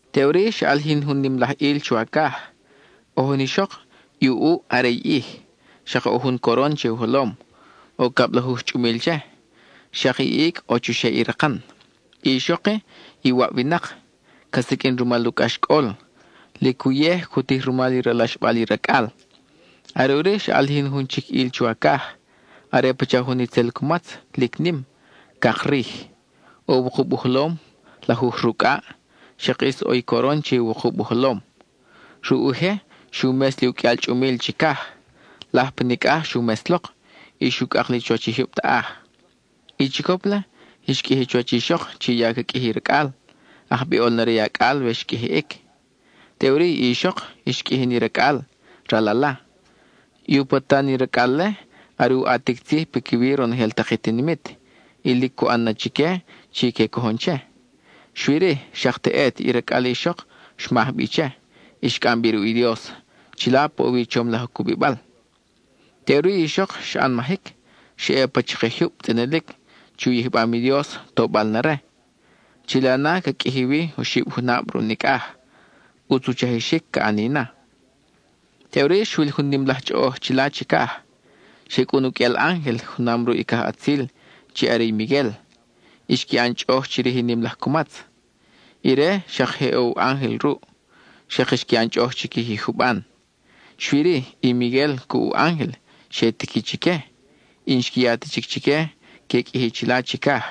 Teʼuri xa ʼalijin jun nim laj ʼil chuwacaj: ʼo jun ixok, i u ʼuʼ are i ʼij; xak ʼo jun coron che u jolom, ʼo cablajuj chʼumil che; xak i icʼ ʼo chuxeʼ i rakan. I ixok-i, iwab winak, ca siqʼuin rumal u cʼaxcʼol; lic uyej cu tij rumal i ralaxbal i racʼal. Are ʼuri xa ʼalijin jun chic ʼil chuwacaj: are pacha jun itzel cumatz, lic nim, cak rij. ʼO wukub u jolom, lajuj rucʼaʼ, xak ʼis ʼo i coron che i wukub u jolom. Ruʼ u je, xu mes li u qʼuial chʼumil chicaj; laj pa nicʼaj xu mes lok, y xu cʼak li chuwach i jyub taʼaj. I chicop-le xqʼuiji chuwach i ixok chi ya ca qʼuiji racʼal, ajbiʼol na re i acʼal we xqʼuijiʼic. Teʼuri i ixok, xqʼuiji ni racʼal, ral ala. I u patan i racʼal-le, are u ʼatic tzij piquiwi ronojel tak i tinimit, y lic cu ʼan na chique chi que cojon che. Xui-ri, xak teʼet i racʼal i ixok xmaj bi che, y xcʼam bi ruʼ i Dios, chila pa ʼo wi i chom laj cubibal. Teʼuri i ixok xa ʼanmajic, xa ʼe pa chakij jyub tzʼinilic chi u yijbam i Dios, tobal na re. Chila na, ca qʼuiji wi oxib junab ruʼ nicʼaj; ʼutz u chajixic ca ʼani na. Teʼuri xwil jun nim laj chʼoʼoj chila chicaj. Xe cʼun u qʼuial ángel junam ruʼ i cajʼatzil, chi are i Miguel; y xqui ʼan chʼoʼoj chirij i nim laj cumatz. Ire, xak je ʼo u ángel ruʼ, xak xqui ʼan chʼoʼoj chiquij i juban. Xui-ri, i Miguel cuʼ u ángel xe tiqui chique, y n-xqui ya ta chic chique que qʼuiji chila chicaj.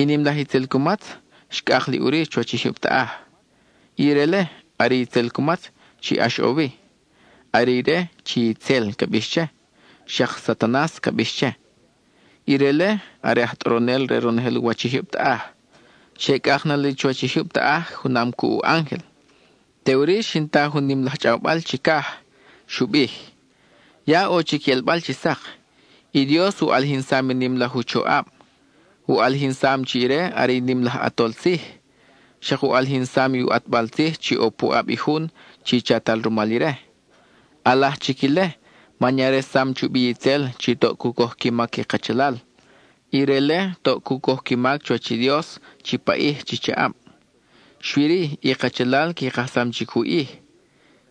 I nim laj itzel cumatz xcʼak li ʼuri chuwach i jyub taʼaj. Ire-le are i itzel cumatz chi ʼax ʼo wi; are ire chi “itzel” ca bix che, xak “Satanas” ca bix che. Ire-le are aj tʼoronel re ronojel u wach i jyub taʼaj. Xe cʼak na li chuwach i jyub taʼaj junam cuʼ u ángel. Teʼuri xin ta jun nim laj chʼawbal chicaj. Xu bij: —¡Ya ʼo chic i ʼelbal chi sak! ¡I Dios u ʼalijinsam i nim laj u choʼab! ¡U ʼalijinsam chi ire are i nim laj ʼAtol Tzij! ¡Xak u ʼalijinsam i u ʼatbal tzij chi ʼo puʼab i Jun chi chatal rumal ire! ʼAlaj chic ile, man ya resam chubi itzel, chi toʼ cu coj qui mac i kachalal; ire-le toʼ cu coj qui mac chuwach i Dios chi paʼij chi chaʼab. Xui-ri, i kachalal qui kajsam chic u ʼij;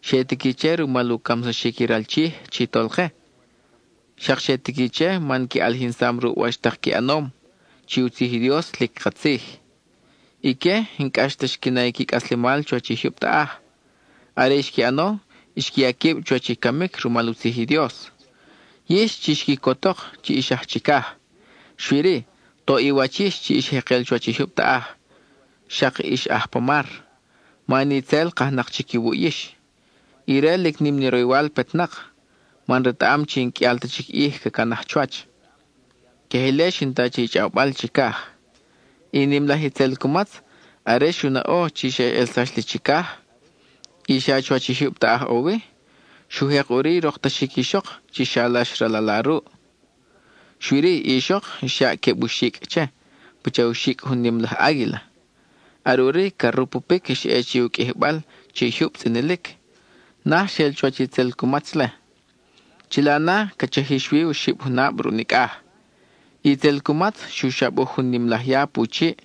xe tiqui che rumal u camsaxic i ral Chij chi Tolke, xak xe tiqui che man qui ʼalijinsam ruʼ wach tak qui ʼanom, chi u tzij i Dios lic katzij. Ique, n-cʼax ta xqui na i qui cʼaslemal chuwach i jyub taʼaj, are i xqui ʼano, xqui ya quib chuwach i camic rumal u tzij i Dios. ¡Yix, chix quicotok, chi ix aj chicaj! Xui-ri ¡toʼ i wach yix chi ix jekel chuwach i jyub taʼaj, xak ix aj pa mar! Man itzel kajnak chic iwuʼ yix. Ire, lic nim ni roywal petnak, man retaʼam chi n-qʼuial ta chic ʼij ca canaj chuwach. (Queje ile xin ta che i chʼawbal chicaj.) I nim laj itzel cumatz, are xu naʼo chi xa ʼelsax li chicaj, y xa chuwach i jyub taʼaj ʼo wi, xu jek ʼuri i roktaxic i ixok chi xalax i ral ala ruʼ. Xui-ri, i ixok, xyaʼ queb u xicʼ che, pacha u xicʼ jun nim laj águila. Are ʼuri, ca rupupic xa ʼe che i u qʼuijibal che i jyub tzʼinilic; naj xel chuwach itzel cumatz-le. Chila na, ca chajix wi oxib junab ruʼ nicʼaj. I itzel cumatz xu xabuj jun nim laj ya pu chiʼ,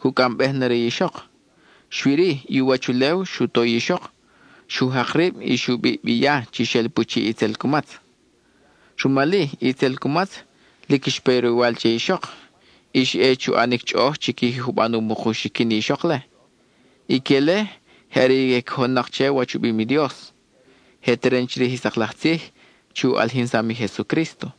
cu cʼambej na re i ixok. Xui-ri, i u wach ulew xu to i ixok; xu jak rib y xu biʼ bi i ya chi xel pu chiʼ i itzel cumatz. Rumal-i, i itzel cumatz, lic xpe i roywal che i ixok, y xa ʼe chu ʼanic chʼoʼoj chiquij i juban u muk u xiquin i ixok-le. Ique-le je are i que cojon che wach u bim i Dios; je teren chirij i sak laj tzij chi u ʼalijinsam i Jesucrísto.